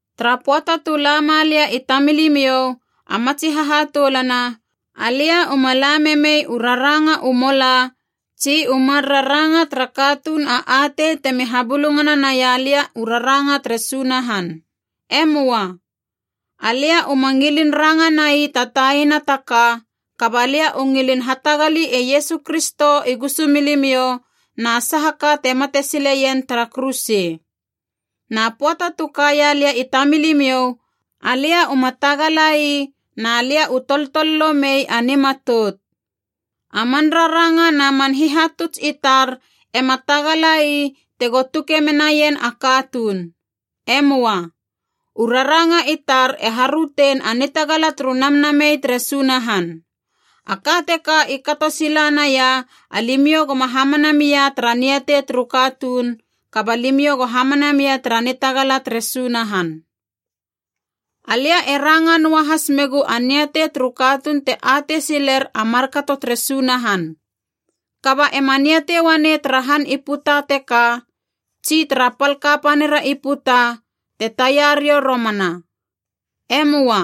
Tara pöata tu lama lia i tamilimiou, a matsi hahatoulana, alia uma la memei u raranga u mola tsi u mar raranga tara katuun a atei temi habulungana naia lia u raranga tere Sunahan. E möa. Alia uma ngilin ranga nai ta taina ta ka kaba lia u ngilin hatagali e Iesu Kristo i gusumilimiou na saha ka te mate sileien tara kuruse. Na pöata tu kaia lia i tamilimiou, alia uma tagala ii na lia u toltololo mei a nimatout. A man raranga na man hihatuts i tar ema tagala ii tego tuke menaien a katuun. E möa. U raranga i tar e harötein a nitagala turu Namnamei tere Sunahan. A ka teka i kato sila naia alimiou goma hamana mia tara niatei turu katuun, kaba limiou go hamana mia tara nitagala tere Sunahan. Alia e ranga noa has megu a niatei turu katuun te atei siler a markato tere Sunahan. Kaba ema niatei uanei tara han i puta teka tsi tara pal kapanira i puta te taia riou romana. E möa.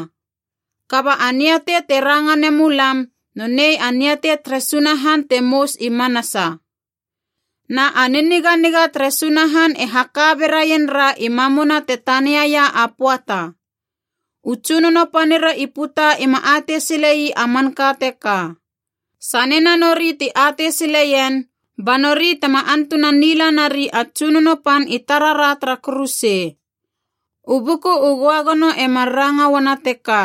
Kaba a niatei te ranga nemu lam nonei a niatei tere Sunahan te mous i manasa. Na a niniganiga tere Sunahan e haka beraien ra i mamuna te taniaia a pöata. U tsunono panira i puta ima atei sile ii a manka teka. Sanena nori ti atei sileien, ba nori tema antunan nila nari a Tsunono Pan i tarara tara kuruse. U Buku u Göagono e mar ranga uana teka: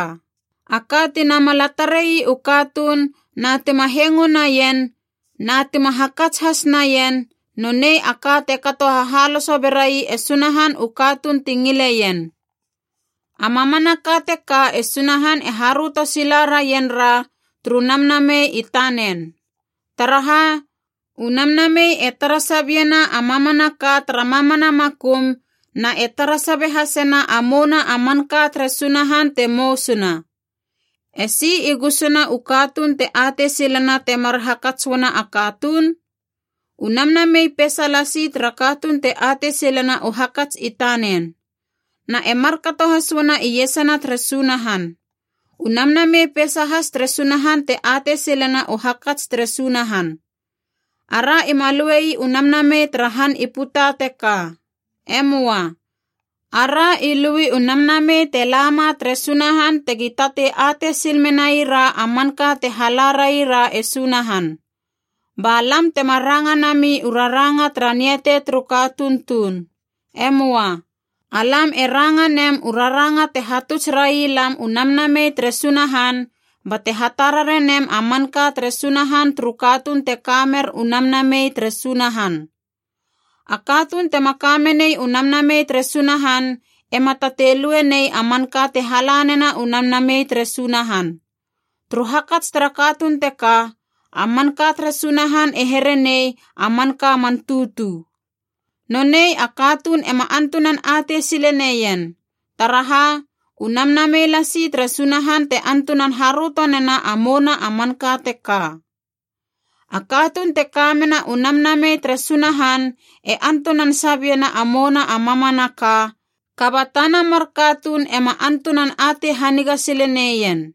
“A ka ti namala tare ii u katuun na tima hengo naien na tima hakats has naien, nonei a ka te kato hahaloso berai e Sunahan u katuun ti ngileien.” A mamanaka teka e Sunahan e haröto sila raien ra turu Namnamei i tanen. Taraha u Namnamei e tara sabiena a mamanaka tara mamana makum na e tara sabe hasena a mouna a manka tere Sunahan te mousuna. Esi i gusuna u katuun te atei silena temar hakats uana a katuun? U namnamei peisa lasi tara katuun te atei silena u hakats i tanen. Na e markato has uana iesana tere Sunahan. U Namnamei peisa has tere Sunahan te atei silena u hakats tere Sunahan. Ara ima lue ii u namnamei tara han i puta teka. E möa. Ara i lui u Namnamei te lama tere Sunahan tegi tatei atei sil menai ra a manka te hala raira e Sunahan. Ba lam tema ranga nami u raranga tara niatei turu katuun tuun. E möa. Alam e ranga nem u raranga te hatuts railam u Namnamei tere Sunahan bate hatarare nem a manka tere Sunahan turu katuun te ka mer u Namnamei tere Sunahan. A katuun tema ka menei u Namnamei tere Sunahan ema tatei lue nei a manka te hala nena u Namnamei tere Sunahan. Turu hakats tara katuun teka, a manka tere Sunahan e here nei a manka man tutu. Nonei a katuun ema antunan atei sile neien, taraha u Namnamei lasi tere Sunahan te antunan haröto nena a mouna a manka teka. A katuun te ka mena u Namnamei tere Sunahan e antunan sabiena a mouna a mamanaka, kaba tana mar katuun ema antunan atei haniga sile neien.